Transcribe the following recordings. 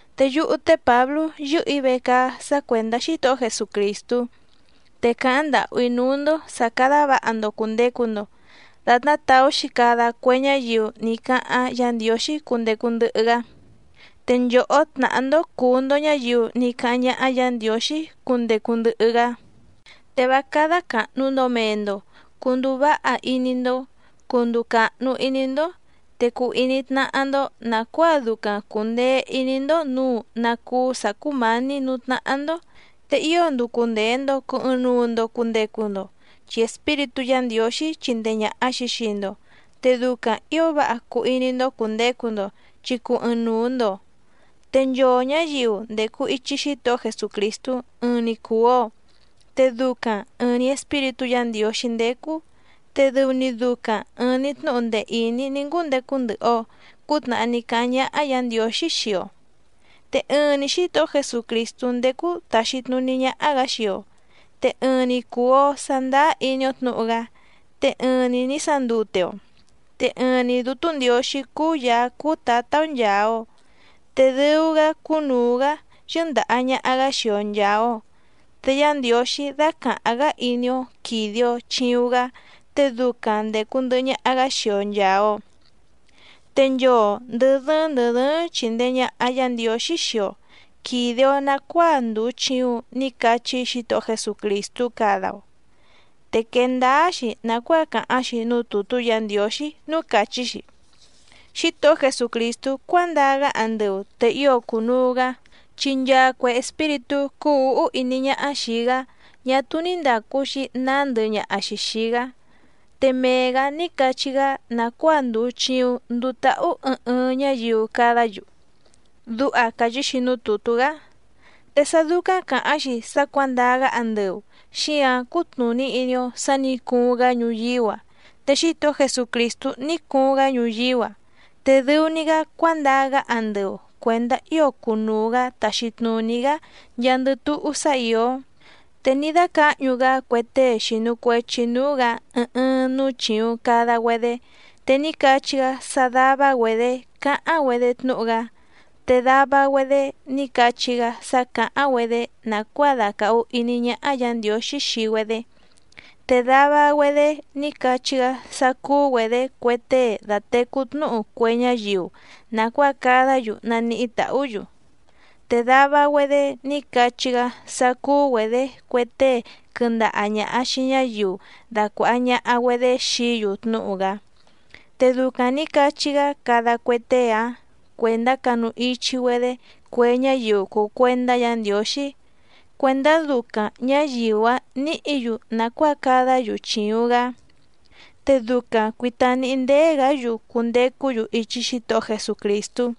Te yúhú té Pǎblú yɨ́hɨ̀‑í vecaá sá cuèndá Xítohó Jesucrìstú, te càháⁿ ndàhú‑í núú‑ndó sǎ cádá vǎha‑ndo cùndecu‑ndo datná tàú‑xi cada cue ñáyiu ní cáháⁿ Yǎ Ndiǒxí cundecu ndɨhɨ‑gá. Te nchòhó tnàhá‑ndó cùu‑ndo ñáyiu ní cáháⁿ ñáhá Yǎ Ndiǒxí cundecu ndɨhɨ‑gá. Te vá cádá càhnu‑ndo mee‑ndo, cunduu váha iní‑ndó, cunduu càhnu iní‑ndó, te cuu iní tnáhá‑ndó nàcuáa ducaⁿ cùndee iní‑ndó nǔu ná cúú sǎ cúmǎní nǔú tnáhá‑ndó. Te ío nducu ndèe‑ndo cuu ɨɨⁿnuu‑ndo cundecu‑ndo, chi Espíritú Yǎ Ndiǒxí chindee ñàha‑xi xii‑ndo, te ducaⁿ ǐo váha cuu iní‑ndó cùndecu‑ndo chi cùu ɨɨⁿnuu‑ndo. Te nchoo ñǎyiu ndècu ichi Xítohó Jesucrìstú ɨɨⁿ‑ni cùu‑o, te ducaⁿ ɨ̀ɨⁿ‑ni Espíritú Yǎ Ndiǒxí ndécú, te dɨu‑ni ducaⁿ ɨ̀ɨⁿ‑ni tnúhu ndee ìní ní ngúndecu ndɨhɨ‑o cǔtnàhá ní cáháⁿ ñáhá Yǎ Ndiǒxí xii‑o. Te ɨɨⁿ‑ni Xǐtohó Jesucrìstú ndécú tàxi tnuní ñáhá‑gǎ xii‑o, te ɨɨⁿ‑ni cùu‑o sandáá iní‑ó tnǔhu‑gá, te ɨɨⁿ‑ni nǐ sandute‑o. Te ɨɨⁿ‑ni Dǔtú Ndiǒxí cúú Yàá cúú Tǎtá‑ó nchàa‑o, te dɨu‑gá cúnùu‑gá yɨ́ndàha ñaha‑gá xii‑o nchàa‑o. Te Yá Ndiǒxí dácàháⁿ‑gá iní‑ó quìde‑o chiuⁿ‑gá, te ducaⁿ ndècu ndɨhɨ ñaha‑gá xii‑o nchàa‑o. Te nchoo ndɨ̀ dɨ́ɨ́ⁿ ndɨ̀ dɨ́ɨ́ⁿ chìndee ñaha Yá Ndiǒxí xii‑o quìde‑o nacuáa ndùu chiuⁿ ní cachí Xítohó Jesucrìstú cada‑o. Te quèe ndáá‑xi nàcuáa càháⁿ‑xi núú tùtú Yǎ Ndiǒxí núú càchí‑xi: Xítohó Jesucrìstú cuándaa‑gá andɨu te ío cùnuu‑gá, chi nchaa cue espíritú cúú ǔhú iní ñáhá xìi‑gá ñá túú ní ndàcu‑xi naá ndɨhɨ ñaha‑xi xìi‑gá, te mee‑gǎ ní cachí‑gá nàcuáa ndùu chiuⁿ nduu táhú ɨɨⁿ ɨɨⁿ ñáyiu cadá‑yu. Duha càchí‑xi núú tùtú‑gá. Te sá dúcáⁿ càháⁿ‑xi sá cuǎndaa‑gá andɨu xíǎⁿ cútnùní iní‑ó sǎ nǐ cuuⁿ‑gá ñuyíú‑a. Te Xítohó Jesucrìstú ní cuuⁿ‑gá ñuyíú‑a, te dɨu‑ni‑gá cuándaa‑gá andɨu cuèndá ío cunuu‑gǎ taxi tnùní‑gá nchaandɨ túhú sá ìó. Te ní dácǎhñu‑gá cue tée xìnu cuechi núú‑gǎ ɨɨⁿ ɨɨⁿ núú chìuⁿ cada‑güedé. Te ní cachí‑gá sá dàva‑güedé cáháⁿ‑güedé tnúhu‑gá, te dava‑güedé ní cachí‑gá sá cǎháⁿ‑güedé nàcuáa dàcahu iní ñáhá Yǎ Ndiǒxí xii‑güedé. Te dava‑güedé ní cachí‑gá sá cúú‑güedě cue tée datècú tnúhu cue ñáyiu nàcuáa cadá‑yu naníhí tàhú‑yu. Te dava‑güedé ní cachí‑gá sá cúú‑güedě cue tée quɨndaha ñàha xii ñáyiu dacuàha ñaha‑güedé xií‑yu tnúhu‑gá. Te ducaⁿ nǐ cachí‑gá cada cue tée‑áⁿ cuèndá canu ichi‑güedé cue ñáyiu cùu cuendá Yǎ Ndiǒxí cuèndá ducaⁿ ñǎyiu‑áⁿ nǐhǐ‑yu nàcuáa cadá‑yu chìuⁿ‑gá, te ducaⁿ cuìta níhí ndéé‑gǎ‑yu cundecú‑yu ichi Xítohó Jesucrìstú.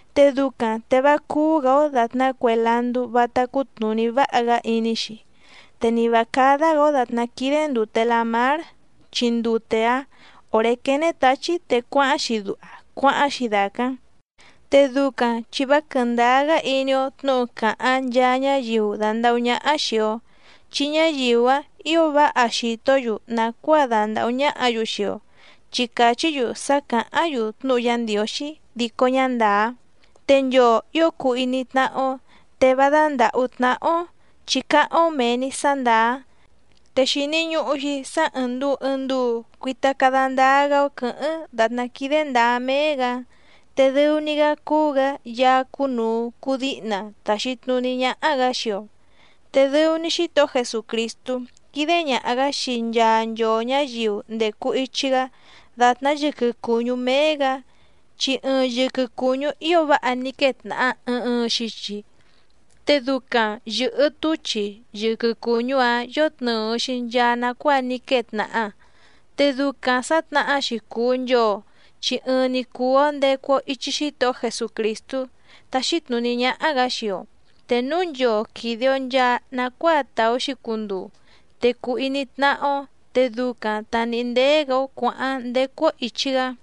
Te ducaⁿ te vá cúú‑gǎ‑ó dàtná cue landú vátá cútnùní váha‑gá iní‑xi, te ni vǎ cádá‑gǎ‑ó dàtná quídé ndùte lamár, chi ndute‑áⁿ òré quéné tǎchí te cuáháⁿ‑xi duha cuáháⁿ‑xi dàcáⁿ, te ducaⁿ chi vá quɨ̀ndáá‑gá iní‑ó tnǔhu càháⁿ nchaa ñáyiu dàndahú ñáhá xìi‑o, chi ñáyiu‑áⁿ ǐo váha xìtó‑yu nàcuáa dandàhú ñáhǎ‑yu xii‑o chi càchí‑yu sá càháⁿ‑yu tnúhu Yá Ndiǒxí dico ñá ndàá. Te nchoo ǐo cuu iní tnáhá‑ó, te vá dándàhú tnáhá‑ó, chi cáháⁿ‑ó mèe‑ni sá ndàá. Te xìni ñuhu‑xi sá ɨ̀ɨⁿ nduu ɨɨⁿ nduu cuita cada ndáá‑gá‑ó quɨ̌hɨ́ⁿ dàtná quídé ndǎá méé‑gǎ, te dɨu‑ni‑gá cúú‑gǎ Yaá cúnùu cuu díhna tàxi tnuní ñáhá‑gǎ xii‑o. Te dɨu‑ni Xítohó Jesucrìstú quídé ñàha‑gá xii nchaa nchoo ñǎyiu ndècu ichi‑gá dàtná yɨquɨ cùñú méé‑gǎ, chi ɨɨⁿ yɨquɨ cùñú ío váha ní quée tnàha ɨɨⁿ ɨɨⁿ xichi, te ducaⁿ yɨ̀hɨ túchi yɨquɨ cùñú‑ǎⁿ yótnɨ̀ɨ‑xi nchaa nacuáa ní quée tnàha. Te ducaⁿ sǎtnahá‑xi cùu nchoo chi ɨɨⁿ‑ni cùu‑o ndecu‑o ichi Xítohó Jesucrìstú táxí tnùní ñáhá‑gǎ xii‑o. Te núu nchoo quìde‑o nchaa nacuáa tàú‑xi cunduu te cùu iní tnáhá‑ó, te ducaⁿ ta nìhí ndéé‑gǎ‑ó cuǎháⁿ ndécú‑ó ìchi‑gá.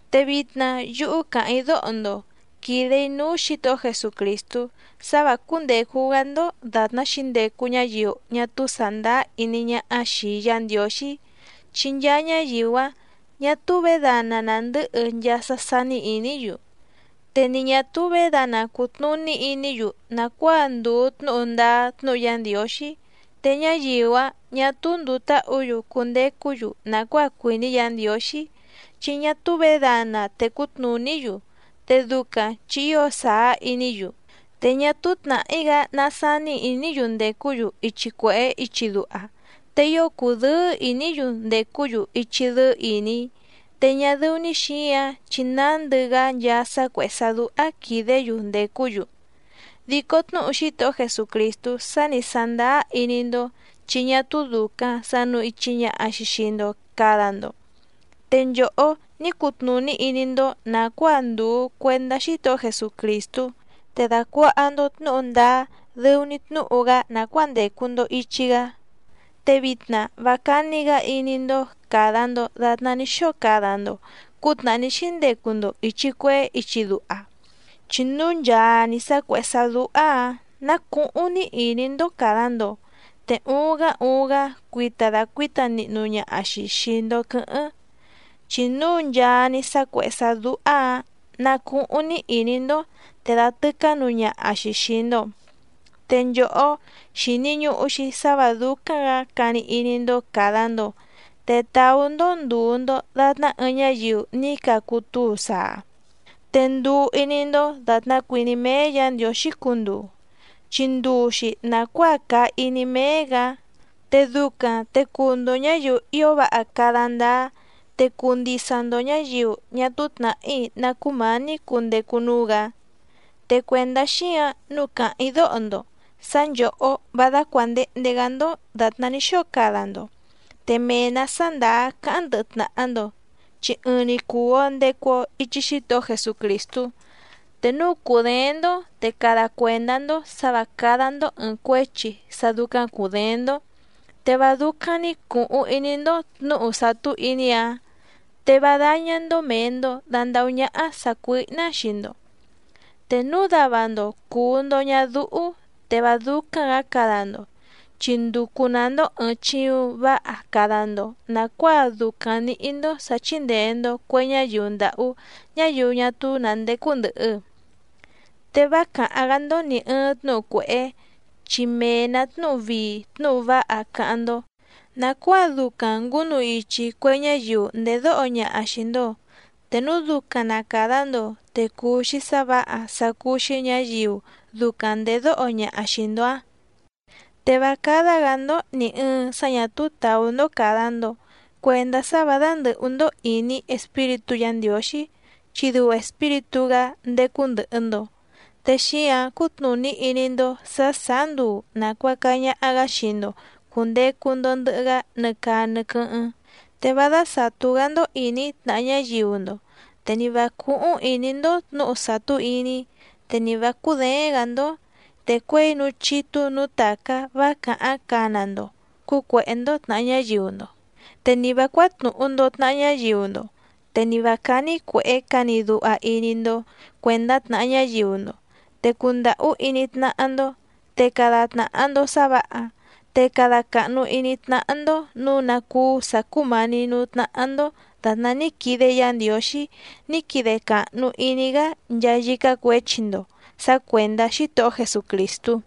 Te vitna yúhú càháⁿ‑í dóho‑ndo quìde‑í núú Xǐtohó Jesucrìstú sá vǎ cúndècu‑gá‑ndó dàtná xǐndecu ñáyiu ñá túú sàndáá iní ñáhá xìi Yá Ndiǒxí, chi nchaa ñáyiu‑áⁿ ñà túú vědana nàndɨ́hɨ nchaa sá sání ìní‑yu. Te ni ñà túú vědana cùtnuní iní‑yu nàcuáa ndùu tnúhu ndáá tnúhu Yá Ndiǒxí. Te ñáyiu‑áⁿ ñà túú ndùu táhǔ‑yu cundecú‑yu nàcuáa cuìní Yǎ Ndiǒxí, chi ñá túú vědana tècú tnùní‑yu te ducaⁿ chi ío sàá iní‑yu. Te ñá túú tnàhí‑gá ná sání ìní‑yu ndècú‑yu ichi cuèhé ichi duha, te ío cùdɨ́ɨ́ ìní‑yu ndècú‑yu ichi dɨ́ɨ́ ìní, te ñá dɨ́ú‑ní xǐǎⁿ chi nándɨ‑gá nchaa sá cuèhé sá dúhá quìdé‑yu ndècú‑yu. Dico tnúhu Xítohó Jesucrìstú sá nǐ sándáá iní‑ndó chi ñá túú dùcaⁿ sanu ichi ñaha‑xi xii‑ndo cada‑ndo. Te nchòhó ní cutnùní iní‑ndó nàcuáa ndùu cuendá Xítohó Jesucrìstú, te dàcuaha‑ndo tnúhu ndáá dɨu‑ni tnúhu‑gá nàcuáa ndècu‑ndo ichi‑gá. Te vitna vá cání‑gǎ iní‑ndó càda‑ndo datná ní xóo cada‑ndo cǔtnàhá ní xíndecu‑ndo ìchi cuehé ichi duha, chi núu nchaa‑ni sá cuèhé sá dúhá‑ǎⁿ ná cùhuⁿ‑ni iní‑ndó càda‑ndo, te uuⁿ‑gá uuⁿ‑gá cuita dacuǐta nihnu ñaha‑xi xìi‑ndo quɨ́hɨ́ⁿ, chi núu nchaa‑ni sá cuèhé sá dúhá‑ǎⁿ ná cùhuⁿ‑ni iní‑ndó te dàtɨcá nuu ñaha‑xi xìi‑ndo. Te nchòhó, xìni ñuhu‑xi sá vǎ dúcáⁿ‑gǎ cani iní‑ndó càda‑ndo te tàú‑ndó ndùu‑ndo datná ɨɨⁿ ñáyiu ní cacu túu saa. Te nduu iní‑ndó dàtná cuìní méé Yǎ Ndiǒxí cunduu, chi nduu‑xi nàcuáa càa iní méé‑gǎ, te ducaⁿ te cuu‑ndo ñǎyiu ío váha cada ndáá, te cuu ndisa‑ndo ñǎyiu ñá túú tnàhí ná cumání cundecu núú‑gǎ. Te cuèndá xíǎⁿ nǔu càháⁿ‑í dóho‑ndo sǎ nchòhó vá dácuàndehnde‑gá‑ndó dàtná ní xóo cada‑ndo, te mee‑nǎ sá ndàá cáháⁿ ndɨhɨ tnàha‑ndo, chi ɨɨⁿ‑ni cùu‑o ndecu‑o ichi Xítohó Jesucrìstú. Te núu cùdééⁿ‑ndó te cada cuèndá‑ndó sǎ vǎ cádá‑ndó ɨ̀ɨⁿ cuéchi sá dúcáⁿ cùdééⁿ‑ndó, te vá dúcáⁿ‑ní cùhuⁿ iní‑ndó tnǔhu sàtú iní‑áⁿ. Te vá dáñá‑ndó mèe‑ndo dandahú ñáhá sàcuíhná xii‑ndo. Te núu dava‑ndo cùu‑ndo ñadúhú te vá dúcáⁿ‑gǎ cada‑ndo, chi nducu‑nǎ‑ndó ɨ̀ɨⁿ chiuⁿ váha cada‑ndo nàcuáa ducaⁿ nǐhí‑ndó sǎ chíndèe‑ndo cue ñáyiu ndàhú ñáyiu ñá túú nǎ ndécú ndɨ̀hɨ. Te vá càháⁿ‑gá‑ndó nì ɨɨⁿ tnúhu cuèhé, chi mee‑nǎ tnúhu vii tnúhu váha cáháⁿ‑ndó nàcuáa ducaⁿ ngǔnu ichi cue ñáyiu ndèdóho ñaha xìi‑ndo, te núu ducaⁿ na càda‑ndo te cuu‑xi sá vǎha sá cúú‑xí ñǎyiu ducaⁿ ndèdóho ñaha xìi‑ndo‑áⁿ. Te vá cádá‑gǎ‑ndó nì ɨɨⁿ sá ñà túú tàú‑ndó càda‑ndo cuendá sá vǎ dándɨ̀hú‑ndó ìní Espíritú Yǎ Ndiǒxí, chi dɨu Espíritú‑gá ndécú ndɨ̀hɨ‑ndo, te xíǎⁿ cútnùní iní‑ndó sǎ sàá nduu nàcuaca ñaha‑gá xii‑ndo cùndecu‑ndo ndɨhɨ‑gá nɨ caa nɨ quɨ́hɨ́ⁿ. Te vá dásàtú‑gá‑ndó ìní tnàha ñáyiu‑ndo, te ni vǎ cúhúⁿ ìní‑ndó tnǔhu sàtú iní, te ni vǎ cúděéⁿ‑gǎ‑ndó, te cuěi núú chítú nǔú tàcá vá càháⁿ cana‑ndo cǔcuèhé‑ndó tnàha ñáyiu‑ndo, te ni vǎ cuátnùhu‑ndo tnaha ñáyiu‑ndo, te ni vǎ cání cuèhé cani duha iní‑ndó cuèndá tnàha ñáyiu‑ndo. Te cundàhú iní tnáhá‑ndó, te cada tnàha‑ndo sá vǎha, te cada càhnu iní tnáhá‑ndó nǔu ná cúú sǎ cúmǎní nǔú tnáhá‑ndó dàtná ní quide Yá Ndiǒxí ní quide càhnu iní‑gá nchaa yícá cuěchi‑ndo sǎ cuèndá Xítohó Jesucrìstú.